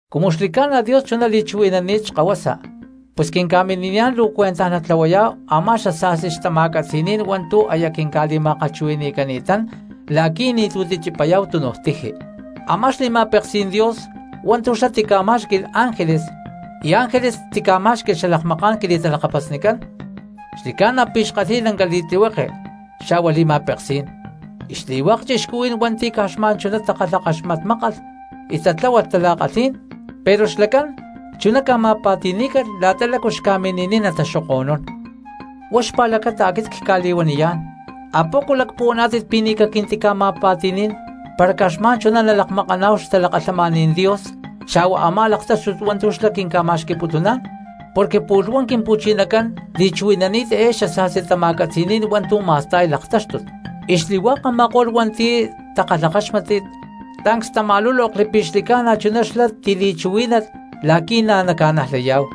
Cumu xli̠ca̠na Dios chuná li̠chuhui̠nani̠t Xkahuasa pus quinca̠mini̠niyá̠n luu cuentaj natlahuayá̠hu a̠má xasa̠sti xtama̠catzi̠ní̠n hua̠ntu̠ aya quinca̠li̠ma̠kalhchuhui̠ni̠cani̠tán la̠qui̠ ni̠tu̠ tichipayá̠hu túnuj tiji. Amá xli̠ma̠peksí̠n Dios hua̠ntu̠ xlá tica̠má̠xqui̠lh ángeles y ángeles tica̠má̠xqui̠lh xalakmaká̠n quili̠talakapasnicán, xli̠ca̠na pi̠ xkalhi̠y lanca li̠tlihueke xa̠hua li̠ma̠peksí̠n; y xli̠hua̠k cristianos hua̠nti̠ caj xma̠n chuná takalhakaxmatmákalh y tatláhualh tala̠kalhí̠n, pero xlacán chuná ca̠ma̠pa̠ti̠ní̠calh la̠ta lácu xca̠mini̠niy nataxoko̠nún. Huá xpa̠lacata aquit cca̠li̠huaniyá̠n: ¿apoco lacpuhuaná̠tit pi̠ ni̠ caquintica̠ma̠pa̠ti̠ní̠n para caj xma̠n chuná nalakmakaná̠hu xtalakalhamaní̠n Dios xa̠hua a̠má laktáxtut hua̠ntu̠ xlá quinca̠ma̠xqui̠putuná̠n? Porque pu̠lh huá Quimpu̠chinacán li̠chuhui̠nani̠t eé xasa̠sti tama̠catzi̠ní̠n hua̠ntu̠ ma̠sta̠y laktáxtut, y xli̠hua̠k a̠ma̠ko̠lh hua̠nti̠ takalhakáxmatli tancs tama̠lúlokli pi̠ xli̠ca̠na chuná xlá tili̠chuhuí̠nalh la̠qui̠ na̠ naca̠najlayá̠hu.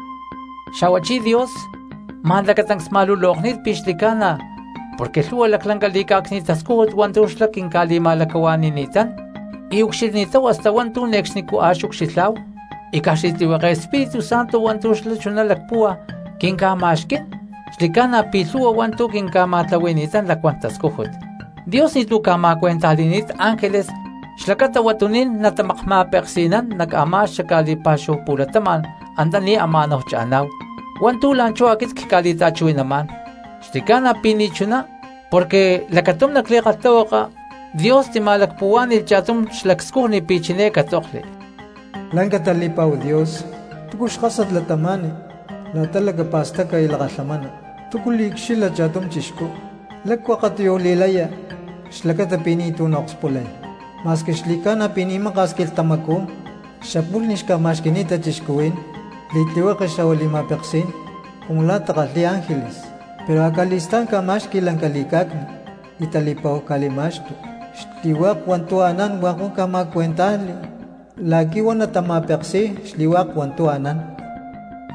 Xa̠huachí Dios ma̠n lacatancs ma̠lulokni̠t pi̠ xli̠ca̠na porque lhu̠hua laclanca li̠cá̠cni̠t tascújut hua̠ntu̠ xlá quinca̠li̠ma̠lacahua̠ni̠ni̠tán, y ucxilhni̠táhu hasta hua̠ntu̠ ne̠cxnicú a̠ xucxilhá̠hu, y caj xli̠tlihueke Espíritu Santo hua̠ntu̠ xlá chuná lacpúhua quinca̠ma̠xquí̠n xli̠ca̠na pi̠ lhu̠hua hua̠ntu̠ quinca̠ma̠tlahui̠ni̠tán lacuán tascújut. Dios ni̠tu̠ ca̠ma̠cuentajli̠ni̠t ángeles xlacata huatuní̠n natamakma̠peksi̠nán nac a̠má xaca̠li̠pá̠xúhu pu̠latama̠n antaní ama̠náhu cha̠ná̠hu, hua̠ntu̠ la̠nchú aquit cca̠li̠ta̠chuhui̠namá̠n. Xli̠ca̠na pi̠ ni̠chuná, porque lacatum nac li̠kalhtahuaka Dios tima̠lacpuhuá̠ni̠lh cha̠tum xlacscujni pi̠ chiné catzokli: Lanca tali̠pa̠hu Dios, ¿túcu xkásat cristiano lácu li̠lacapa̠staca y lakalhamana? ¿Túcu liucxilha cha̠tum chixcú, lácu akatiyuj li̠laya xlacata pi̠ ni̠tu̠ naakspulay? Ma̠squi xli̠cána pi̠ ni̠ maka̠s quilhtamacú xapu̠lh ni̠ xca̠ma̠xqui̠ni̠ta cristianos li̠tlihueke xa̠hua li̠ma̠peksí̠n cumu la̠ takalhi̠y ángeles, pero acali̠stá̠n ca̠ma̠xqui̠ lanca li̠cá̠cni̠t y tali̠pa̠hu ca̠li̠ma̠xtu. Xli̠hua̠k hua̠ntu̠ anán hua̠k huá ca̠ma̠cuentájli la̠qui̠ huá naca̠ma̠peksi̠y xli̠hua̠k hua̠ntu̠ anán.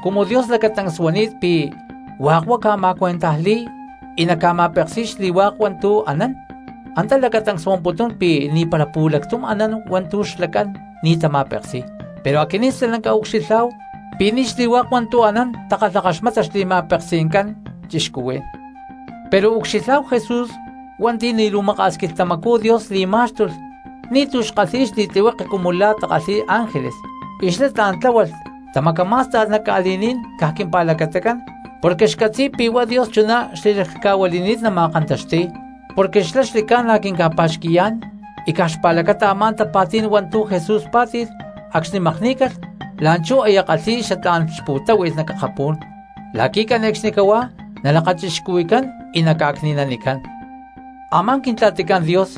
Cumu Dios lacatancs huani̠t pi̠ hua̠k huá ca̠ma̠cuentajli̠y y naca̠ma̠peksi̠y xli̠hua̠k hua̠ntu̠ anán, antá lacatancs huamputún pi̠ ni̠para pu̠lactum anán hua̠ntu̠ xlacán ni̠ tama̠peksi̠y; pero aquinín stalanca ucxilhá̠hu pi̠ ni̠ xli̠hua̠k hua̠ntu̠ anán takalhakaxmata xli̠ma̠peksi̠ncán cristianos. Pero ucxilhá̠hu Jesús hua̠nti̠ ni̠ luu maka̠s quilhtamacú Dios li̠má̠xtulh ni̠tu̠ xkalhi̠y xli̠tlihueke cumu la̠ takalhi̠y ángeles y xlá tla̠n tláhualh tamacamá̠sta̠lh nac ca̠li̠ní̠n caj quimpa̠lacatacán porque xcatzi̠y pi̠ huá Dios chuná xli̠laclhca̠huili̠ni̠t nama̠kantaxti̠y, porque xlá xli̠ca̠na quinca̠pa̠xqui̠yá̠n. Y caj xpa̠lacata a̠má tapa̠tí̠n hua̠ntu̠ Jesús pá̠ti̠lh acxni̠ makní̠calh, la̠nchú aya kalhi̠y xatlá̠n xpu̠táhui̠lh nac akapú̠n la̠qui̠ cane̠cxnicahuá nalakachixcuhui̠cán y naca̠cni̠nanicán. Amá Quintla̠ticán Dios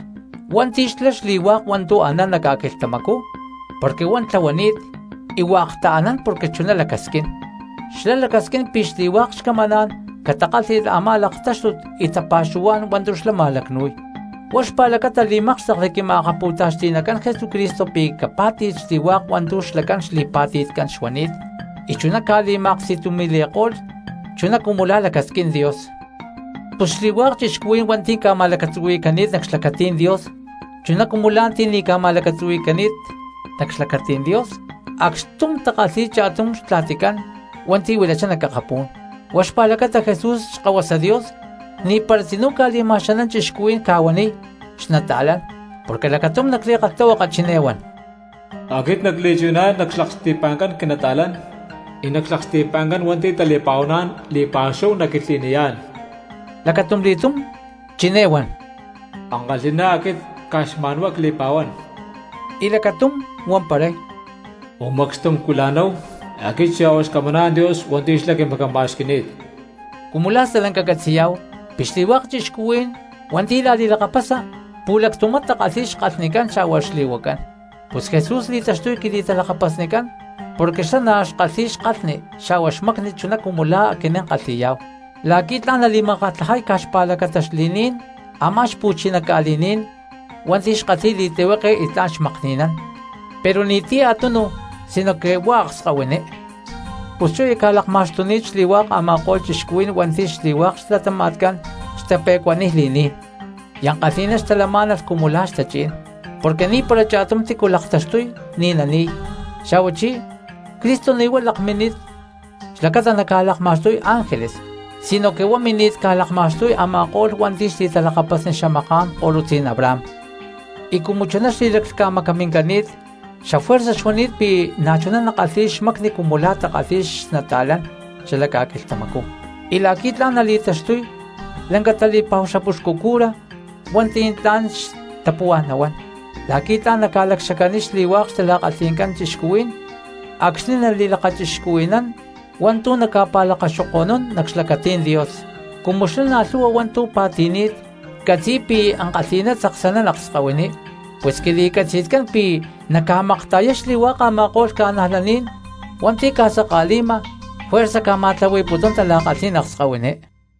hua̠nti̠ xlá xli̠hua̠k hua̠ntu̠ anán nac ca̠quilhtamacú porque huá tlahuani̠t y hua̠k taanán porque chuná lacasquín, xlá lacasquín pi̠ xli̠hua̠k xcamaná̠n catakálhi̠lh a̠má laktáxtut y tapa̠xuhuá̠n hua̠ntu̠ xlá ma̠lacnu̠y. Huá xpa̠lacata li̠mákxtekli Quima̠akapu̠taxti̠nacán Jesucristo pi̠ capá̠ti̠lh xli̠hua̠k hua̠ntu̠ xlacán xli̠pa̠ti̠tcán xuani̠t y chuná ca̠li̠ma̠aksti̠tumi̠li̠ko̠lh chuná cumu lá lacasquín Dios. Pus xli̠hua̠k cristianos hua̠nti̠ ca̠ma̠lacatzuhui̠cani̠t nac xlacatí̠n Dios chuná cumu la̠ ti̠ ca̠ma̠lacatzuhui̠ni̠t nac xlacatí̠n Dios acxtum takalhi̠y cha̠tum xtla̠ticán hua̠nti̠ huilachá nac akapú̠n. Huá xpa̠lacata Jesús Xkahuasa Dios ni̠para tzinú ca̠li̠ma̠xanán cristianos ca̠huaniy xnata̠lán. Porque lacatum nac li̠kalhtahuaka chiné huan: Aquit nacli̠chuhui̠nán nac xlaksti̠pa̠ncán quinata̠lán, y nac xlaksti̠pa̠ncán hua̠nti̠ tali̠pa̠huaná̠n li̠pa̠xúhu nacquilhtli̠niyá̠n. Lacatumli̠túm chiné huan: Ankalhi̠ná aquit caj xma̠n huá cli̠pa̠huán. Y lacatum huamparay: Umacxtum cuila̠náhu, aquit xa̠hua xcamaná̠n Dios hua̠nti̠ xlá quimacama̠xqui̠ni̠t. Cumu la̠ stalanca catzi̠yá̠hu pi̠ xli̠hua̠k cristianos hua̠nti̠ la̠li̠lakapasa pu̠lactumá takalhi̠y xkalhnicán xa̠hua xli̠huacán, pus Jesús li̠táxtulh quili̠talakapasnicán porque xlá na̠ xkalhi̠y xkalhni xa̠hua xmacni chuná cumu la̠ aquinín kalhi̠yá̠hu, la̠qui̠ tla̠n nali̠makatlajay caj xpa̠lacata xli̠ní̠n a̠má xpu̠chiná ca̠li̠ní̠n hua̠nti̠ xkalhi̠y li̠tlihueke y tla̠n xmakni̠nán pero ni̠ti̠cu a̠tunu sinoque huá akskahuiní. Pus chú aya ca̠lakma̠xtuni̠t xli̠hua̠k a̠ma̠ko̠lh cristianos hua̠nti̠ xli̠hua̠k xlatama̠tcán xtape̠cuaniy li̠ní̠n y ankalhi̠ná xtalamá̠nalh cumu la̠ xtachí̠n porque ni̠para cha̠tum tícu laktaxtuy ni̠ nani̠y. Xa̠huachí Cristo ni̠ huá lakmini̠t xlacata naca̠lakma̠xtuy ángeles, sinoque huá mini̠t ca̠lakma̠xtuy a̠ma̠ko̠lh hua̠nti̠ xli̠talakapasni xamaká̠n ko̠lutzí̠n Abraham. Y cumu chuná xli̠laclhca̠macamincani̠t xafuerza xuani̠t pi̠ na̠chuná nakalhi̠y xmacni cumu la̠ takalhi̠y xnata̠lán xalac ca̠quilhtamacú y la̠qui̠ tla̠n nali̠taxtuy lanca tali̠pa̠hu xapuxcu cura hua̠nti̠ tla̠n xtapuhuá̠n nahuán, la̠qui̠ tla̠n naca̠lacxacaniy xli̠hua̠k xtala̠kalhi̠ncán cristianos acxni̠ nali̠lakachixcuhui̠nán hua̠ntu̠ naca̠pa̠lacaxoko̠nún nac xlacatí̠n Dios. Cumu xlá na̠ lhu̠hua hua̠ntu̠ pa̠ti̠ni̠t, catzi̠y pi̠ ankalhi̠ná tzaksanán akskahuiní pus quili̠catzi̠tcán pi̠ naca̠makta̠yay xli̠hua̠k a̠ma̠ko̠lh cristianos hua̠nti̠ ca̠saka̠li̠ma juerza ca̠ma̠tlahui̠putún tala̠kalhí̠n akskahuiní.